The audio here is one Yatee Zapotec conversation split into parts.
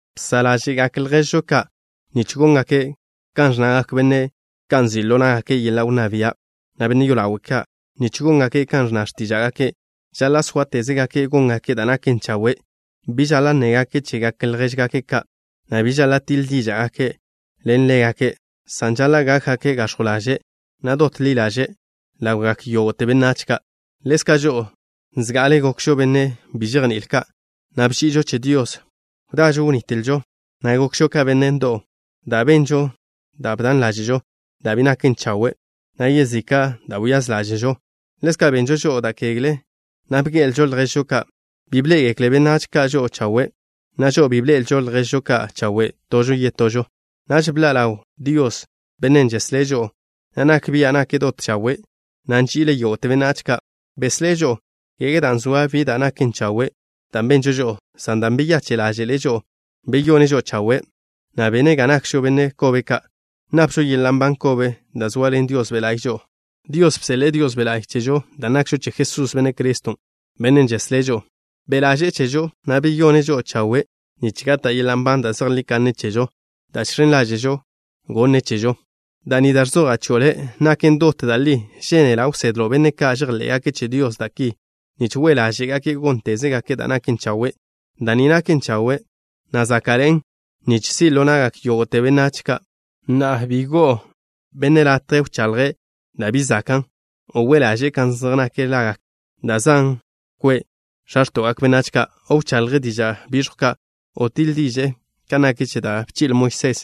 Bsa' ḻáže'gak lježžo ka' nich góngake' kan ẕnnagak benne' ka' nzi' ḻo ná'gake' yeḻa' wnná bia', na' benne' yolawe' ka', nich góngake' kan ẕnna x̱tíža'gake'. Žaḻa' sóatezgake' góngake' da' naken chawe'. Bi žaḻa' nnégake' chegak ljéžgake' ka', na' bi žaḻa' tiḻ díža'gake' len ḻégake', san žaḻa' gákgake' gax̱jw ḻaže', na' dot ḻi ḻaže' ḻawgak yógo'te benách ka'. Ḻezka' žo'o, zga'ale gokžo benne' bi žejni'ile ka', na' bži'ižo che Dios. Wdažo wnitlžo, na' gokžo ka benne' ndo'w ka', dan' benžo da' bdan ḻáže'žo, da' bi naken chawe', na' yezika' da' wyáz ḻáže'žo. Ḻezka' benžo žo'o da' kegle, na' bge'elžo lježžo ka'. Bi bḻé'egekle benách ka' žo'o chawe', na' žo'o bi bḻe'elžo lježžo ka' chawe' tožo yetožo. Naž bḻa' ḻaw Dios, Bennen' žeslé' žo'o, na' nak bia' nake' dot chawe', na' nži'ile' yógo'te benách ka'. Beslé' žo'o, kege dan' zoa bi da' naken chawe' da' benžo žo'o, san dan' beyache' ḻáže'le' žo'o. Beyone' žo'o chawe', na' bene' ga nakžo benne' kobe ka'. Napžo yeḻa' nban kobe dan' zoaḻen Dios Be' La'y žo'o. Dios bseḻe'e Dios Be' La'y chežo dan' nakžo che Jesús, Benne' Criston', Bennen' žeslé' žo'o. Be' ḻaže'e chežo, na' beyone' žo'o chawe' nich gata' yeḻa' nban da' zejlí kanne chežo, dan' žx̱en ḻáže'žo gonne' chežo. Da' ni da' ẕzoja' chio' le' naken dot da' li. Žénela' wsedlo' benne' ka' žejḻé'gake' che Dios, da' ki, nich we' ḻáže'gake' góntezgake' da' naken chawe'. Da' ni naken chawe', na' záka'ḻe'en nich si' ḻo na'gak yógo'te benách. Na'a, bi go'o no benne' latje wchaḻje' da' bi zakan', o we' ḻaže'e kan zej nak lagak da' zan kwe' x̱a x̱to'gak benách ka', o wchaḻje' diža' biẕjw ka', o tiḻ diže'e kan nak che da' bchi'le Moisés.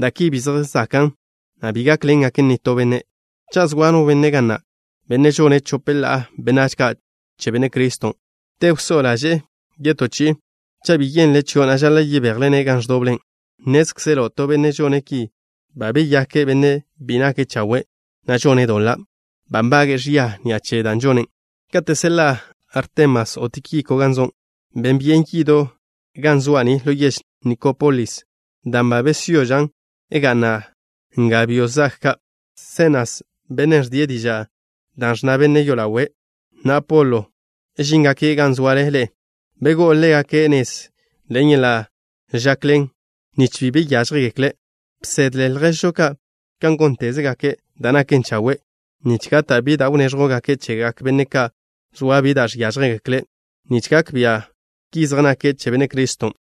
Da' ki bi zej zakan', na' bi gákḻengaken nitó benne'. Cha' zoa no benne' ga na', benne' žone' chope ḻa'a benách ka' che Benne' Criston', te wsó'o ḻaže'e to yetó chi'i, cha' bi yenle' chio', na' žaḻa' yebejle-ne' gan ẕdoble. Nnézkzelo' to benne' žone' ki ba beyake' benne' bi nake' chawe', na' žone' doḻa'. Ba nbage'e ẕia ni'a che dan' žone'. Kate' seḻa'a Artemas o Tíkiko gan zo', ben byen yido' ga zoa' ni ḻo yež Nikópolis, dan' ba besyožan' ga'na' nga byo' zag ka'. Senas, bennen' ẕdie' diža' da' ẕnna benne' yolawe', na' Apolo, žíngake' gan zoale ḻe'e. Begó'o ḻégake' nez ḻen yeḻa' žakḻen, nich bi be yážjegekle'. Bsedle lježžo ka' góntezgake' da' naken chawe', nich gata' bi da' wnéẕjwgake' chegak benne' ka' zoa bi da' žiážjegekle', nich gak bia' ki zej nake' che Benne' Criston'.